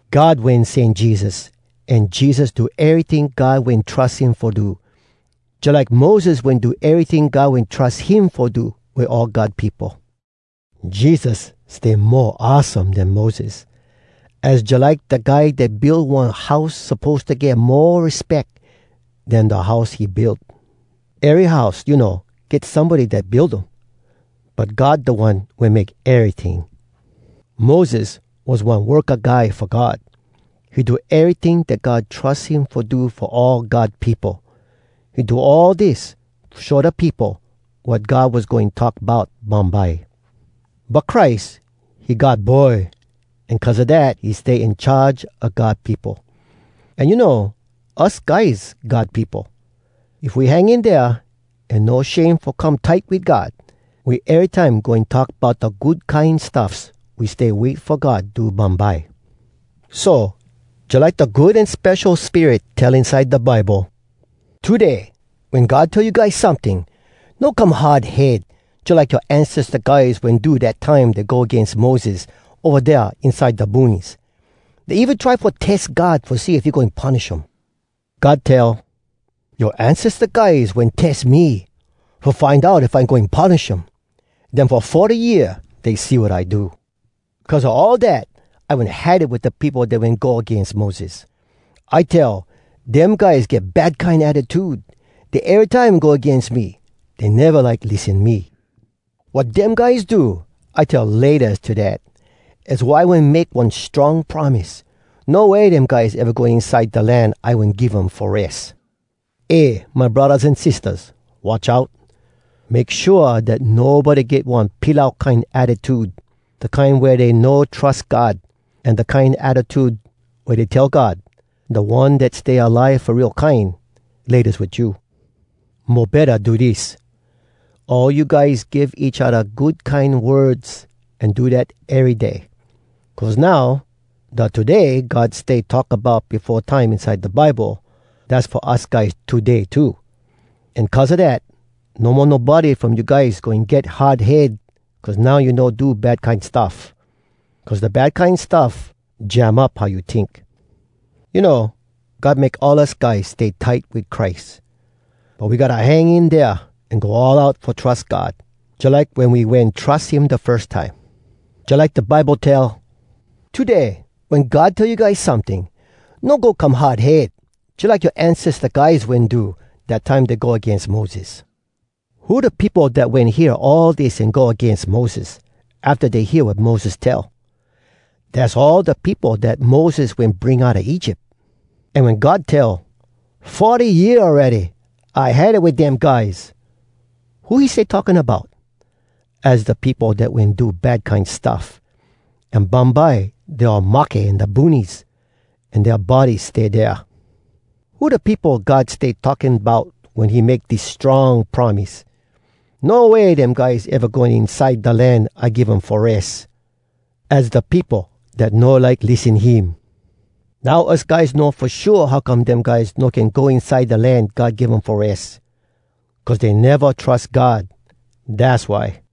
God wen sen Jesus, an Jesus do eryting God wen trus him fo do, jalike Moses wen do eryting God wen trus him fo do wit all God peopo. Jesus stay mo awesome den Moses. Az jalike da guy dat build one house suppose to get mo respeck den da house he build. Ery house, you know, get somebody dat build um. But God da One wen make eryting. Moses was one worka guy fo God. He do eryting dat God trus him fo do fo all God peopo. He do all dis fo show da peopo wat God was goin talk bout bumbye. But Christ, he God Boy, an cuz a dat, he stay in charge a God peopo. An you know, us guys God peopo. If we hang in dea, an no shame fo come tight wit God, we erytime goin talk bout da good kine stuffs we stay wait fo God do bumbye. So, jalike da Good An Spesho Spirit tell inside da Bible, “Today, wen God tell you guys someting, No come hard head, Jalike yoa ancesta guys wen do Dat time dey go agains Moses, Ova dea inside da boonies. Dey even try fo tes God Fo see if he goin punish um.” God tell, “Yoa ancesta guys wen tes me. Fo find out if I goin punish um. Den fo forty year dey see wat I do. Cuz a all dat, I wen had it Wit da peopo dat wen go agains Moses. I tell, ‘Dem guys get bad kine attitude. Dey erytime go agains me. Dey neva like lissen me.’ Wat dem guys do, I tell ‘Laytas’ to dat. Az why I wen make one strong promise: ‘No way dem guys eva going inside Da land I wen give um fo res!’” Eh, my braddahs an sistahs, watch out! Make shua dat nobody get one pilau kine attitude, da kine wea dey no trus God, an da kine attitude wea dey tell God, da One dat stay alive fo real kine, “Laytas wit you!” Mo betta do dis: all you guys give each odda good kine words an do dat ery day. Cuz now, da “Today” God stay talk bout befo time inside da Bible, dass fo us guys today too. An cuz a dat, no mo nobody from you guys goin get hard head cuz now you no do bad kine stuff. Cuz da bad kine stuff jam up how you tink. You know, God make all us guys stay tight wit Christ. But we gotta hang in dea an go all out fo trus God, jalike wen we wen trus him da firs time. Jalike da Bible tell, “Today, wen God tell you guys someting, No go come hard head, Jalike yoa ancesta guys wen do, Dat time dey go agains Moses.” Who da peopo dat wen hear all dis an go agains Moses, afta dey hear wat Moses tell? Dass all da peopo dat Moses wen bring outa Egypt. An wen God tell, “Forty year awready, I had it wit dem guys!” who he stay talking bout? Az da peopo dat wen do bad kine stuff, an bumbye dey all mahke in da boonies, an dea bodies stay dea. Who da peopo God stay talking bout wen he make dis strong promise: “No way dem guys eva goin go inside da land I give um fo res”? Az da peopo dat no like lissen him. Now us guys know fo shua how come dem guys no can “go inside da land God give um fo res.” Cuz dey neva trus God, dass why.